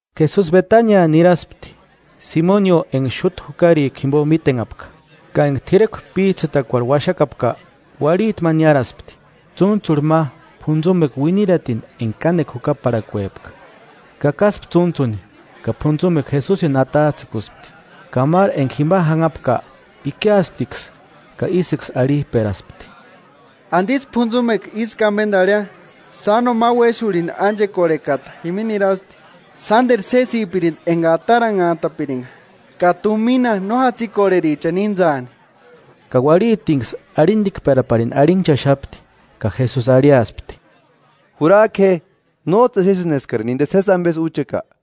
Jesusi Betania niraspti, Simonio, enga xúta jukarikua jimbo mítenhapka. Ka enga t'irekua p'íjtsïtakuarhu uaxakapka, uarhiti ma niáraspti, tsúntsurhu ma p'untsumekua uiniratini enga kánekua jukaparhakuepka. Kakaspti tsúntsuni ka p'untsumekua Jesusini atajtsïkuspti. Ka máru enga jima janhapka ikiasptiksï ka ísïksï arhijperaspti: –¿Andisï p'untsumekua ísku ambendarheia? Sáno ma uéxurhini ánchekorhekata jimini nirasti, sánderu sésipirindi enga ataranhantapiringa ka tumina no jatsikorherichani íntsaani. Ka uarhitinksï arhindikperaparini arhinhchaxapti. Ka Jesusi arhiaspti: –Jurajku je. ¿Nójtsï exesïni eskarini sési ambesï úcheka?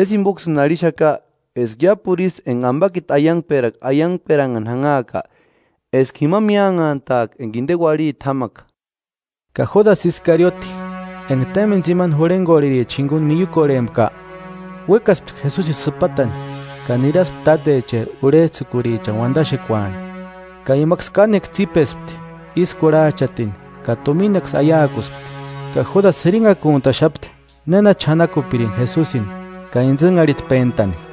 Sési jimboksïni arhixaka eska iápuru ísï enga ambakiti aiangperakua aiangperanhani janhaaka eska jima míanhantaaka enga inde uarhiti jámaka. Ka Júdasï Iskarioti, enga témbeni tsimani jurhengorhericha jinguni miiukorhempka, uékaspti Jesusini sïpatani, ka niraspti tátecheri urhejtsïkurichani uandaxekuani. Ka imaksï kánekua tsípespti ísï kurhajchatini ka tuminaksï aiakuspti. Ka Júdasï jirinhakuntaxapti néna ch'anakupirini Jesusini ka intsïnharhitpentani.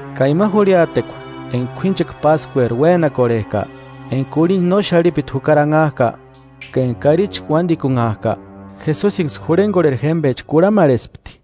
Ka ima jurhiatekua enga k'uínchekua Páskueri uénakorhejka, enga k'urhinda no xarhipiti jukari anhajka, ka enga karichi uándikunhajka. Jesusinksï jurhengorheri jémbecha kurhamarhespti: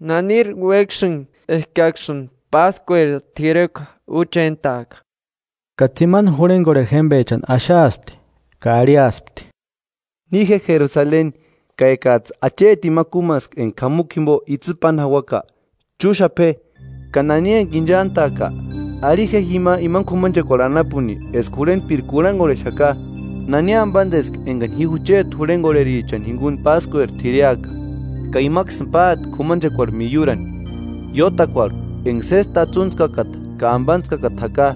–¿Naniri uéksïni eskaksïni Páskueri t'irekuani úchentaaka? Ka tsimani jurhengorheri jémbechani axaaspti ka arhiaspti: Ni je Jerusaleni, ka ekajtsï achetini ma kúmaska enga k'amukua jimbo itsï páni jauaka; chúxapa je, Ka nani enga inchantka, arhi je jima imani k'umanchekuarhu anapuni eska jurhentpiri kurhangorhexaka: ¿Nani ambandeski engani ji jucheti jurhengorherichani jinguni Páskueri t'ireaka? Ka imaksïni páati k'umanchekuarhu miiurani, iótakuarhu enga sési tatsuntskakata ka ambantskakata jaka.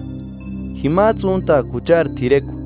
Jimajtsï úntaaka juchari t'irekua.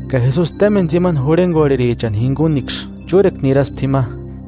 Ka Jesusi témbeni tsimani jurhengorherichani jinguniksï chúrekua niraspti jima.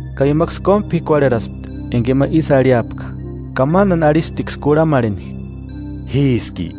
Ka imaksï kómu p'ikuarheraspti enga ima ísï arhiapka ka mándani arhisptiksï kurhamarheni: –¿Jíski?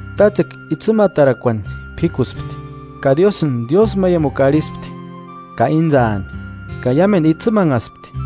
Tátsekua itsïmatarakuani p'íkuspti, ka Diósïni diósïmaiamukua arhispti ka íntsaani, ka iámendu itsïmanhaspti.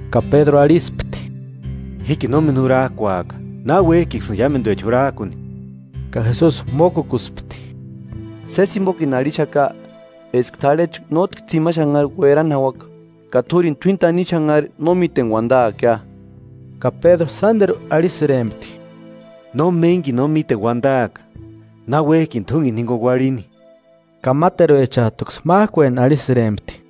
Ka Pédru arhispti: –Jíkini nómeni jurajkuaka, náuejkiksïni iámenduecha jurarkuni. Ka Jesusi mókukuspti: –Sési jimbokini arhixaka, eska t'arhechu nótki tsimani xanhari uerani jauaka, ka t'úrini t'uíni tanimu xanhari no míteni uandaakia. Ka Pédru sánderu arhisïrempti: –No ménikini no míteni uandaaka, náuejkini t'úngeni jinguni uarhini. Ka máteruechajtuksï májkueni arhisïrempti.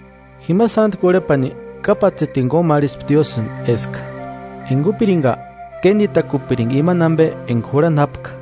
Jima sántku urhepani kápatsetini kómarhispti Diósïni eska, enga úpiringa, kénditakupiringa imani ambe enga jurhani jápka.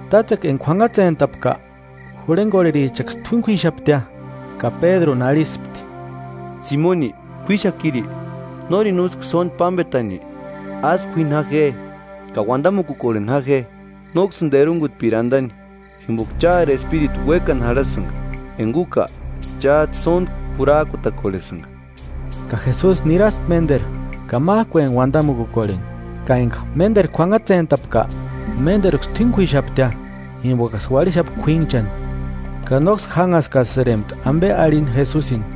Tátsekua enga k'uanhatsentapka, jurhengorherichaksï t'uíni k'uíxaptia. Ka Pédruni arhispti: –Simoni, ¿K'uixakiri? ¿Nórini úski sóndi pámbetani? Asï k'uíni ja je, ka uandamukukorheni ja je, nóksïni terungutpiri andani. Jimboka chári espíritu uékani jarhasïnga, enga úka chájtsï sóntku jurajkutakorhesïnga. Ka Jesusi niraspti ménderu ka májkueni uandamukukorheni. Ka enga ménderu k'uanhatsentapka, ménderuksï t'uíni k'uíxaptia, jimbokaksï uarhixapka k'uínchani. Ka nóksï jánhaskasïrempti ambe arhini Jesusini.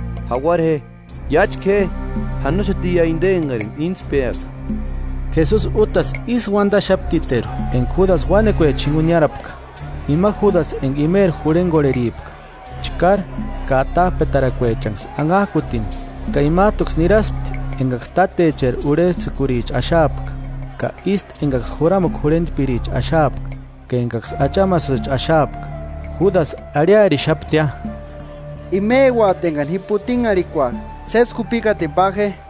Jauara je, iáchka je; janoxatiia inde engarini íntspeaka. Jesusi útasï ísï uandaxaptiteru enga Júdasï uánekuecha jinguni niárapka, ima Judasï enga imeri jurhengorheripka, chkári ka atajpetarakuechanksï anhajkutini. Ka imajtuksï niraspti engaksï tátecheri urhejtsïkuricha axaapka ka ístu engaksï juramukua jurhentpiricha axaapka ka engaksï achamasïcha axaapka. Júdasï arhiarixaptia: “Imeuati engani ji putinharhikuaka, sési jupikatini pa je.”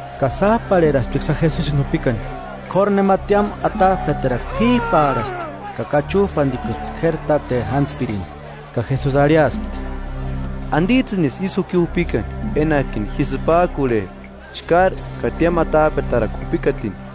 Ka sájparherasptiksïa Jesusini jupikani. K'óru nema tiámu atajpetarakua p'ijpaarhaspti ka kachujpandikuspti k'éri táteri jántspirini. Ka Jesusi arhiaspti: –¿Andijtsïnisï ísï juki jupikani, enajkini ambe ji sïpajkurhe, chkári ka tiámu atajpetarakua jupikatini?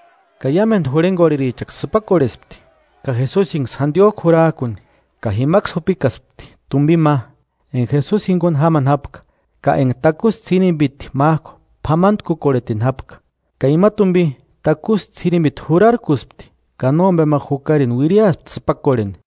Ka iámendu jurhengorherichaksï sïpakorhespti, ka Jesusiniksï jandiojku jurarkuni. Ka jimaksï jupikaspti tumbini ma, enga Jesusi jinguni jámani jápka ka enga takusï ts'irimbiti májku p'amantkukorhetini jápka. Ka ima tumbi takusï ts'irimbiti jurarkuspti ka nómbe ma jukarini uiriaspti sïpakorheni.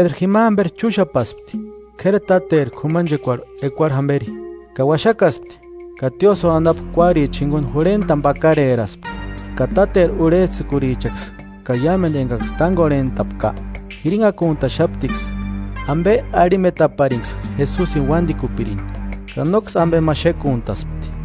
Pédru jima jamberi chúxapaspti, k'éri táteri k'umanchekuarhu ekuarhu jamberi, ka uaxakaspti ka tiósïo anapu kuárichani jinguni jurhentani pakareraspti. Ka táteri urhejtsïkurichaksï, ka iámendu engaksï tángorhentapka, jirinhakuntaxaptiksï ambe arhimetaparinksï Jesusini uándikupirini, ka nóksï ambe ma xékuntaspti.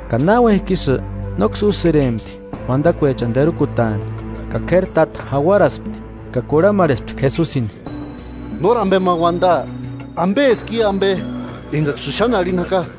Ka náuejki ísï, nóksï úsïrempti uandakuechani terukutaani. Ka k'éri táta jauaraspti, ka kurhamarhespti Jesusini: –¿Nóri ambe ma uandaa? ¿Ambeski i ambe engaksïni xáni arhini jaka?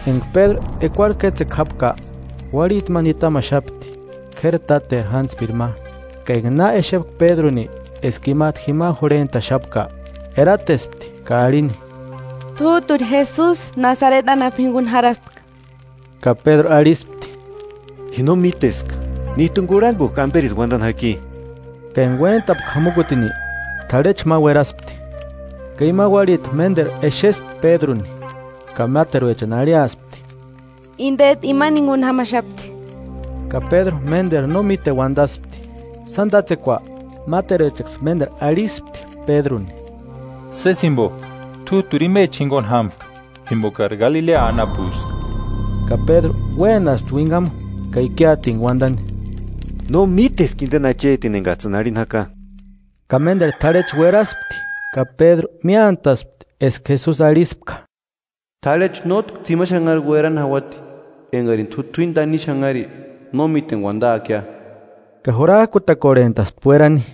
Enga Pédru ekuarhu kétsekua jápka, uarhiti ma nitamaxapti, k'éri táteri jántspiri ma; ka enga na exepka Pédruni eska imajtu jima jurhentaxapka, eratespti ka arhini: –T'újturi Jesusi Nasareti anapu jinguni jarhaspka. Ka Pédru arhispti: –Ji no míteska, níjtuni kurhangujki amberisï uandani jaki. Ka enga uéntapka jamukutini, t'arhechu ma ueraspti. Ka ima uarhiti ménderu exespti Pédruni ka máteruechani arhiaspti: –Indejtu imani jinguni jámaxapti. Ka Pédru ménderu no míteni uandaspti. Sáni tátsekua, máteruechaksï ménderu arhispti Pédruni: –Sési jimbo t'újturi imecha jinguni jámka, jimbokari Galilea anapueska. Ka Pédru uénaspti uinhamu ka ikiatintku uandani: –¡No míteska indeni achetini engajtsïni arhini jaka! Ka ménderu t'arhechu ueraspti ka Pédru míantaspti eska Jesusi arhispka: “T'arhechu nótki tsimani xanhari uerani jauati engarini t'u t'uini tanimu xanhari no míteni uandaakia.” Ka jurajkutakorhentaspti uerani.